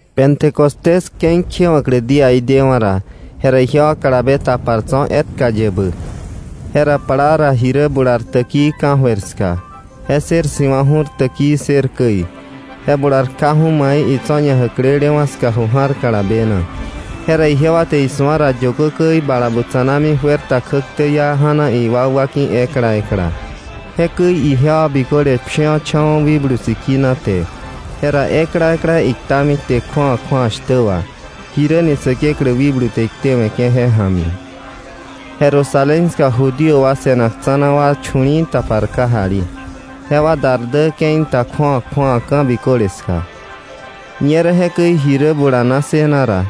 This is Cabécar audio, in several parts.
Pentecostés ke̱i kjewa̱klä díaí dewa̱ ra, jera ijewa kalabe tapar tso̱ etka yebä. Jera plaa ra ji rä bular täkii ka̱jöir ska. Je ssër si̱wa̱ ju̱r täkii ssër käi, je bular kjaju̱ mai itso̱ ñajäklelewa̱ ska ju ja̱r kalabe na. Jera ijewa te isu̱a ra yökö käi bala butsa̱nami juer ta kjäktä iá ja̱na iwakwa ki̱ ekla ekla. Jekäi ijewa biköle pshiwa̱cha̱wa̱ Wikblu Sikina te. Jera ekla ekla iktami kte kju̱awa kju̱awa shtä wà, jiräni Säkeklä Wikblu te iktewe̱ke̱ je ja̱mi. Jerusalén ska Judío wa se̱nak tsa̱na wa chu̱li̱i̱ tapar kajali. Jewa dar dä ke̱i ta kju̱awa kju̱awa ka̱ biköle ska. Ñerä jekäi ji rä bulana ssëna ra,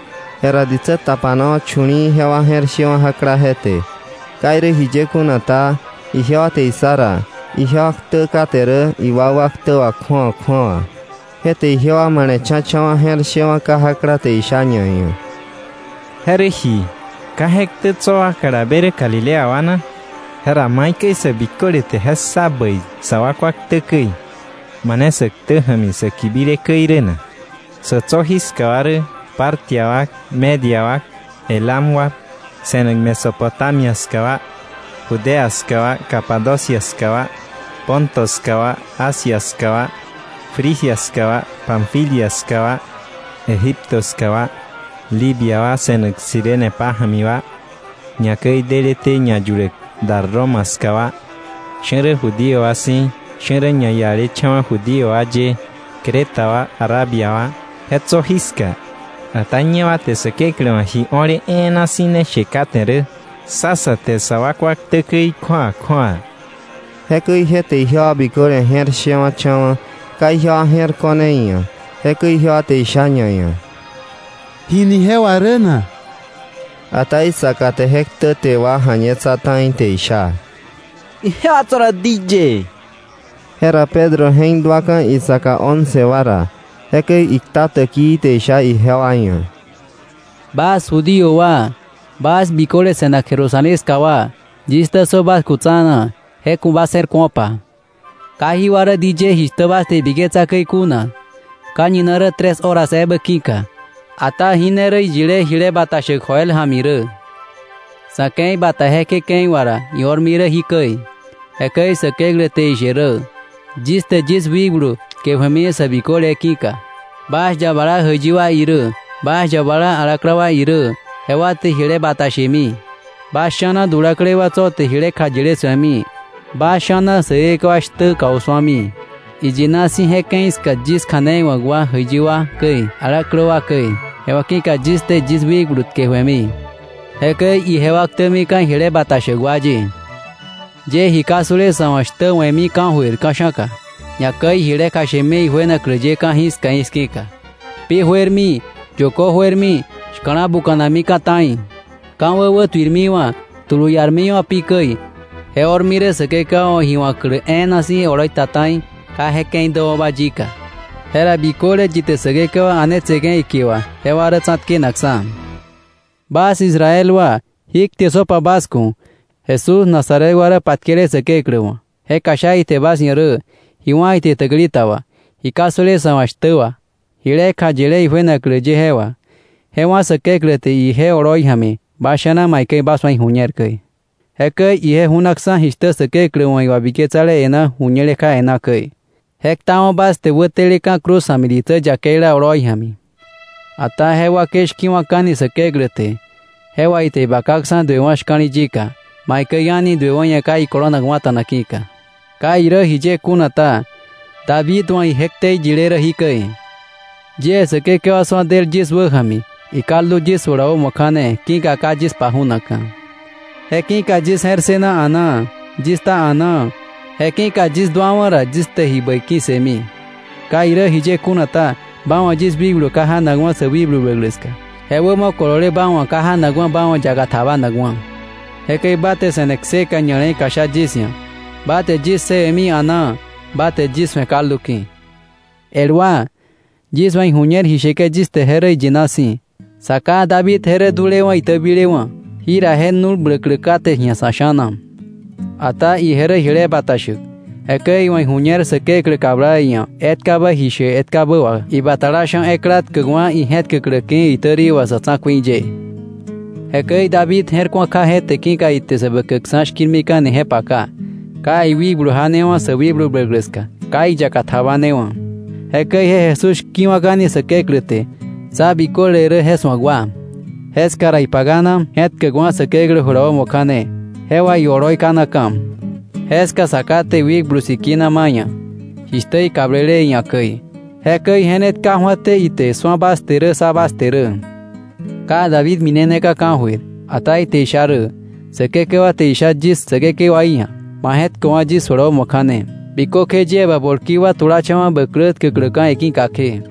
jera ditsä tapanawa̱ chu̱li̱i̱, jewa je̱r shewa̱ jakla je te. Ka irä jiye kuna ta, ijewa te issa ra ijewa ktä kate rä iwakwa ktä wà kju̱awa kju̱awa. Je te ijewa male̱cha̱cha̱wa̱ je̱r shewa̱ kajakla te isha ñaia̱: —¿Je rä ji? ¿Ka je ktä tso̱ wa kalabe rä Galilea wa na? ¿Jera maikäi sä biköle te je ssa bäi, sa wakwa ktä käi, mane sä ktä ja̱mi sä kibile käi rä na? Sa̱ tso̱ jiska wa rä Partia wa, Media wa, Elam wa, se̱nak Mesopotamia ska wa, Judea ska wa, Capadocia ska wa, Ponto ska wa, Asia ska wa, Frigia ska wa, Panfilia ska wa Egipto ska wa, Libia wa se̱nak Cirene pája̱mi wa, ñakäi deleté ñayuläk dar Roma ska wa; sha̱ rä Judío wa si̱, sha̱ rä ñaialecha̱wa̱ Judío wa ye, Creta wa, Arabia wa, je tso̱ jiska. Ata ñewa te Säkeklä wa̱ ji o̱le e̱e̱na si̱ ne she kate rä, ssa sa te sa wakwa ktä käi kju̱awa kju̱awa. Jekäi je te ijewa biköle je̱r shewa̱cha̱wa̱, ka ijewa je̱r ko̱r iia̱. Jekäi ijewa te isha ñaia̱: —¿Jini je wà rä na? Ata isaka te je ktäte wa ja̱ñetsa ta̱i te isha: —Ijewa tso̱ rä diyëë. Jera Pedro je̱k duaka̱ isaka once wa ra. Jekäi ikta täkii te isha ijewa ia̱: “Bas Judío wa, bas biköle se̱nak Jerusalén ska wa, yis ktä ssö bas ku̱ tsa̱na, je ku̱ bas je̱r ku̱opa, ka jí wa rä diyëë jishtä bas te ibiketsa käi kuna, ka̱ñina rä tres hora ebä ki̱ka. Ata jí ne rä iyile jile bata shäk Joel ja̱mi rä: ‘Sa̱ ke̱i bata jekje ke̱i wà ra, io̱rmi rä jikäi: —jekäi Säkeklä te ishe rä—, Yis te yis wikblu tkeju̱emi sä biköle ki̱ka. Bas yabala jäiyi wa irä, bas yabala alaklä wa irä, jewa te jile bata shemi. Bas sha̱na dulaklei wa tso̱ te jile kjayile su̱emi, bas sha̱na säkekewa shtä kausu̱ami. Iyina si̱ je ke̱i ska yis kja̱nei wa̱k wa jäiyi wa käi, alaklä wa käi, jewa ki̱ka yis te yis wikblu tkeju̱emi. Jekäi ijewa ktämika̱ jile bata shäk wa ye. Yie ji ka su̱le sa̱ wa̱ shtä we̱mi ka̱jöir ka̱sha̱ka, ñakäi jile kjashemi ijuenaklä ye ka̱jiska i̱ski̱ka, pi juermi, yökö juermi, shka̱la buka̱namika̱ ta̱i. Ka̱wä wätuirmiwa̱, tulu iarmiwa̱ pi käi. Je o̱rmi rä Säkekewa wa̱ ji wa̱klä e̱e̱na si̱ oloi ta ta̱i, ka je ke̱i däwa̱ba yika. Jera biköle yi te Säkekewa a̱netseke̱ ikie wà, jewa rä tsa̱tkenakksa̱.” “Bas Israel wa, jí kte ssöpa bas ku̱: Jesús Nazaret wa rä patkele Säkeklä wa̱ je kjasha ite bas ia̱ rä, ji wá̱ ite täkili ta wà, ji ka su̱le sa̱ wa̱ shtä wà, jile kjayile ijuenaklä ye je wà. Je wá̱ Säkeklä te ije oloi ja̱mi bas sha̱na maikäi bas wa̱ iju̱ñer käi. Jekäi ije ju̱naksa̱, jishtä Säkeklä wa̱ iwabiketsale e̱ná, ju̱ñele kja e̱ná käi. Je ktawa̱ bas te wäteleka̱ cruz ja̱mi ditsä yakeila oloi ja̱mi. Ata je wakei shki̱wa̱ka̱ni Säkeklä te. Je wà ite ibakaksa̱ duewa̱ shka̱li̱ yika, maikäi a̱ni duewa̱ ia̱ ka ikolonakwa̱ta̱na ki̱ka. Ka irä jiye kuna ta, David wa̱ ije ktei yile rä jikäi: “Yie Säkekewa su̱a del yis wäja̱mi. Ikaldu yis jula wämo kja̱ne, ki̱ka ka yis paju̱nakka̱. Je ki̱ka yis je̱r ssëna a̱naa, yis kta a̱naa, je ki̱ka yis duawa̱ ra, yis te ji bäi ki̱ssëmi. Ka irä jiye kuna ta, ba wa̱ yis wikblu ka janakwa̱ sä wikblu bläklä ska. Je wämo kolole ba wa̱ ka janakwa̱ ba wa̱ yaka tjabanakwa̱. Jekäi ba te se̱ne kseka ña̱le̱i kjasha yis ia̱. Ba te yis ssëwe̱mi a̱naa ba te yis su̱e kaldu ki̱.” “El wa, yis wa̱ ijuñer ji sheke̱ yis te je rä iyina si̱, sa ká David je rä dulewa̱ itäbilewa̱. Jira je nu̱l bläklä kate ji̱a sa̱ sha̱na. Ata ije rä jile bata shäk. Jekäi iwa̱ iju̱ñer Säkeklä kabla iia̱ etkabä ji she etkabä wà ibatala sha̱ ekla tkäkwa̱ ije̱tkäklä ki̱ iitäri wà sa̱ tsa̱ku̱i ye. Jekäi David je̱r ku̱a kja je te, ki̱ka ite Säbäkäkksa̱ shki̱rmika̱ni je paka, ka iwikblu janewa̱ sä wikblu bläklä ska, ka iyaka tjabanewa̱. Jekäi je Jesús shki̱wa̱ka̱ni Säkeklä te. Sá biköle rä je su̱ak wa. Jeska ra ipakana je̱tkäkwa̱ Säkeklä jula wämo kja̱ne, je wà ioloi kanaka̱. Jeska Sa Ká te Wikblu Sikina ma̱ iia̱, jishtä ikablele iia̱ käi. Jekäi je ne tka ju̱até ite, su̱a bas te, ssa bas te rä. Ka David mineneka̱ ka̱jöir, ata ite isha rä: “Säkekewa te isha yis Säkekewaí ia̱: ‘Ma je̱tköwa̱ yis jula wämo kja̱ne, bikökje yie ba bolki wa tulacha̱wa̱ bä klä tkäkläka̱ iki̱ka kje.’”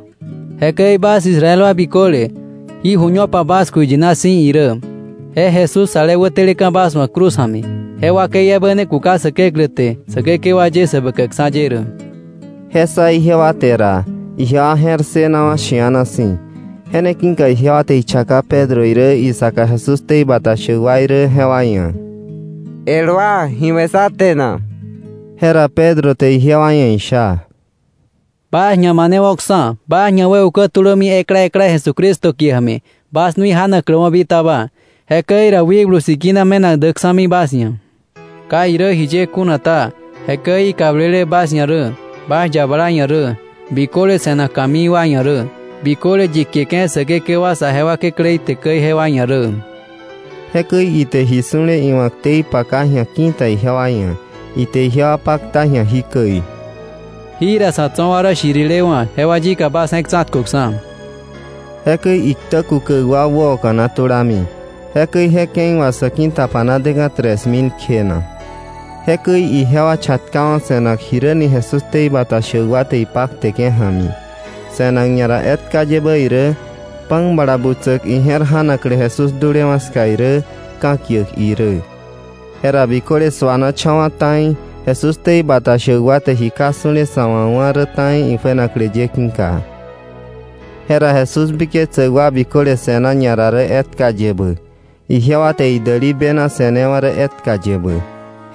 “Jekäi bas Israel wa biköle, jí ju̱ñopa bas ku̱ iyina si̱ irä. Je Jesús ale wäteleka̱ bas wa̱ cruz ja̱mi, je wakei ebä ne kuka Säkeklä te Säkekewa ye, Säbäkäkksa̱ ye rä.” Je ssa ijewa te ra, ijewa je̱r ssënawa̱ shi̱ana si̱. Je ne ki̱ka ijewa te ichaka Pedro irä isaka Jesús ktei bata shäk wa irä, jewa ia̱: —El wa, ¿ji we̱ sá te na? Jera Pedro te ijewa ia̱ isha: —Bas ñamanewo̱ksa̱, bas ñawäukewo̱ tulömi ekla ekla, Jesucristo kie ja̱mi, bas nui janakläwa̱ bitaba. Jekäi ra Wikblu Sikina me̱nak däksa̱mi bas ia̱. Ka irä jiye kuna ta, jekäi ikablele bas ia̱ rä, bas yabala ia̱ rä, biköle se̱nak ka̱mii wa ia̱ rä, biköle yi kieke̱ Säkekewa saje wa Kekläí te käi jewa ia̱ rä. Jekäi ite ji su̱le iwa̱ ktei paka ji̱a ki̱ta ijewa ia̱, ite ijewa pakta ji̱a jikäi: —Jira sa̱ tso̱ wa rä shirilewa̱, jewa yika bas je̱k tsa̱tköksa̱. Jekäi iktä kukäk wa wäoka̱na tulami. Jekäi je ke̱i wà sä ki̱tapana deka̱ tres mil kjena. Jekäi ijewa chatkawa̱ se̱nak jiräni Jesús ktei bata shäk wa te ipakteke̱ ja̱mi, se̱nak ñara etka yebä irä, pan bala butsäk ije̱r ja̱naklä Jesús dulewa̱ ska irä, ka̱kiäk irä. Jera biköle suanacha̱wa̱ ta̱i, Jesús ktei bata shäk wa te ji ka su̱le sa̱ wa̱ wá̱ rä ta̱i ijuenaklä ye ki̱ka. Jera Jesús biketsäk wa biköle se̱na ñara rä etka yebä. Ijewa te idäli bena se̱newa̱ rä etka yebä.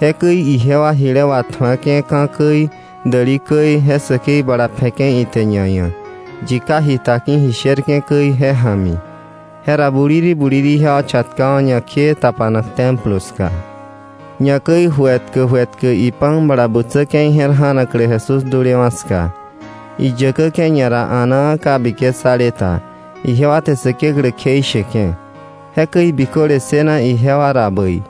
Jekäi ijewa jile watju̱ake̱ ka̱ käi, däli käi, je säkei bala pje̱ke̱ ite ñaia̱, yi ka jita ki̱ ji sherke̱ käi, je ja̱mi. Jera buliri buliri ijewa chatkawa̱ ñakjee tapanak Templo ska. Ñakäi ju etkä ju etkä ipan bala butsäke̱ ije̱r ja̱naklä Jesús dulewa̱ ska. Iyäkäke̱ ñara a̱naa ka biketsale ta, ijewa te Säkeklä kjeisheke̱. Jekäi biköle ssëna ijewa ra bäi.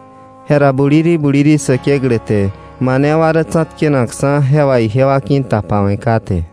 Jera buliri buliri Säkeklä te mane wa rä tsa̱tkenakksa̱ jewa ijewa ki̱tapawe̱ kate.